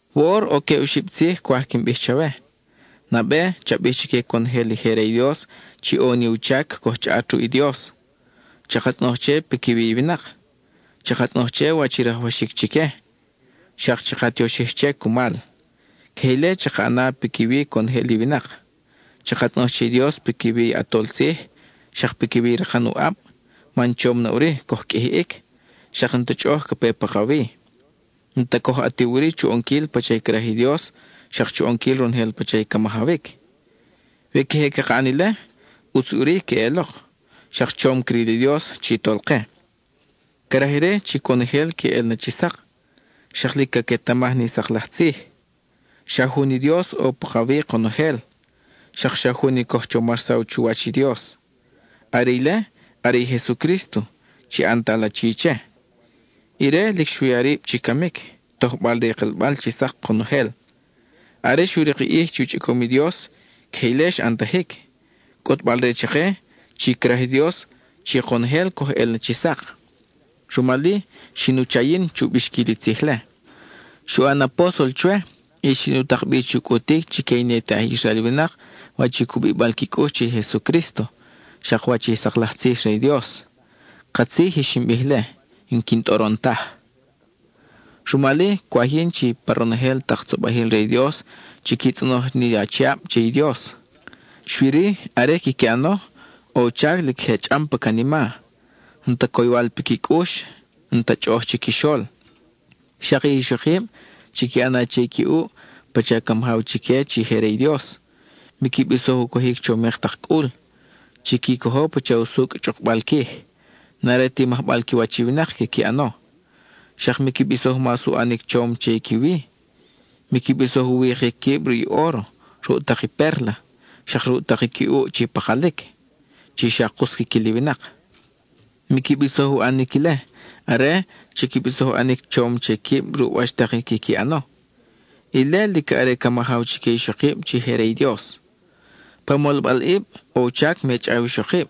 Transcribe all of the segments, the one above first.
Woʼor ʼo queb oxib tzij cwaj quin bij chawe: nabe, cha bij chique conojel i je re i Dios chi ʼo ni u chac coj chʼaʼat ruʼ i Dios, chaka tzʼonoj che piquiwi i winak, chaka tzʼonoj che wach i rajwaxic chique, xak chaka tioxij che cumal. Queje ile chaka ʼana piquiwi conojel i winak. Chaka tzʼonoj che i Dios piquiwi i ʼatol tzij, xak piquiwi i rakan u ʼab, man chom na ʼuri coj qʼuijiʼic, xak n-ta chʼoʼoj ca pe pakawi. N-ta coj ʼatiw ʼuri chu ʼonquil pacha craj i Dios xak chu ʼonquil ronojel pacha i ca majawic. We queje caka ʼan ile, ʼutz ʼuri queʼelok, xak chom cril i Dios chi Tolke. Craj ire chi conojel que ʼel na chi sak; xak lic caquetamaj ni sak laj tzij. Xa jun i Dios ʼo pakawi konojel, xak xa jun i coj chomarsaw chuwach i Dios; are ile, are i Jesucrísto, chi ʼantal achi che. Ire lic xu ya rib chi camic, tojbal re i kelbal chi sak konojel. Are xu rik i ʼij chi u chʼicom i Dios, queje ile xa ʼantajic, cʼutbal re chake chi craj i Dios chi konojel coj ʼel na chi sak. Rumal-i, xin u cha yin chu bixquil i tzij-le; xu ʼan apóstol chwe, y xin u tak bi chu cʼutic chique i ne te aj Israel winak wach i u cubibal qui cʼux che i Jesucrísto, xak wach i sak laj tzij re i Dios. Katzij i xin bij-le; n-quin tʼoron taj. Rumal-i, cwaj yin chi pa ronojel tak tzobajil re i Dios chiqui tzʼonoj ni achiab che i Dios. Xui-ri, are quiqui ʼano, ʼo u chac lic je chʼam pa canima, n-ta coywal piqui cʼux, n-ta chʼoʼoj chiquixol. Xak i ixokib, chiqui ʼana che i qui ʼuʼ pacha ca majaw chique chi je re i Dios. Miqui bisoj u cojic chomik tak cʼul; chiqui cojo pacha usucʼ chʼukbal quij, n-are ti majbal qui wach i winak quiqui ʼano. Xak miqui bisoj mas u ʼanic chom che i qui wi; miqui bisoj u wikic quib ruʼ i óro, ruʼ tak i pérla, xak ruʼ tak qui ʼuʼ chi pakalic, chi xa kus quiquil i winak. Miqui bisoj u ʼanic ile; are, chiqui bisoj u ʼanic chom che quib ruʼ wach tak i quiqui ʼano. Ile lic are ca majaw chique ixokib chi je re i Dios. Pa molbalʼib, ʼo u chac me chʼaw i ixokib;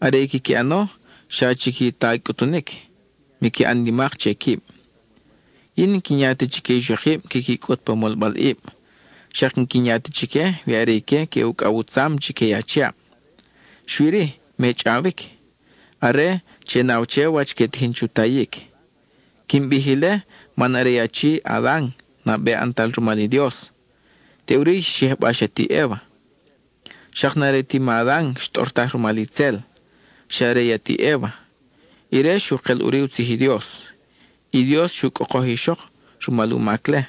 are i quiqui ʼano xa chiqui ta i cʼutunic, miqui ʼan nimak che quib. Yin n-quin ya ta chique ixokib quiqui cʼut pa molbalʼib; xak n-quin ya ta chique we are ique que ucʼaw u tzam chique i achiab. Xui-ri, me chʼawic; are, che naw che wach que tijin chu tayic. Quin bij ile man are i achi Adan nabe ʼantal rumal i Dios, teʼuri xyijbax i ati Eva. Xak n-are ti ma Adan xtʼortaj rumal itzel, xa are i ati Eva; ire xu kel ʼuri u tzij i Dios. (I Dios xu cʼokoj i ixok rumal u mac-le;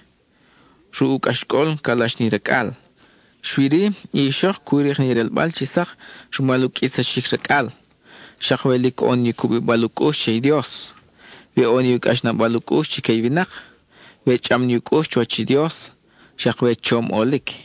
ruʼ u cʼaxcʼol calax ni racʼal.) Xui-ri, i ixok cu rik ni relbal chi sak rumal u qʼuitsaxic racʼal, xak we lic ʼo ni u cubibal u cʼux che i Dios, we ʼo ni u cʼaxnabal u cʼux chique i winak, we chʼam ni u cʼux chuwach i Dios, xak we chom ʼolic.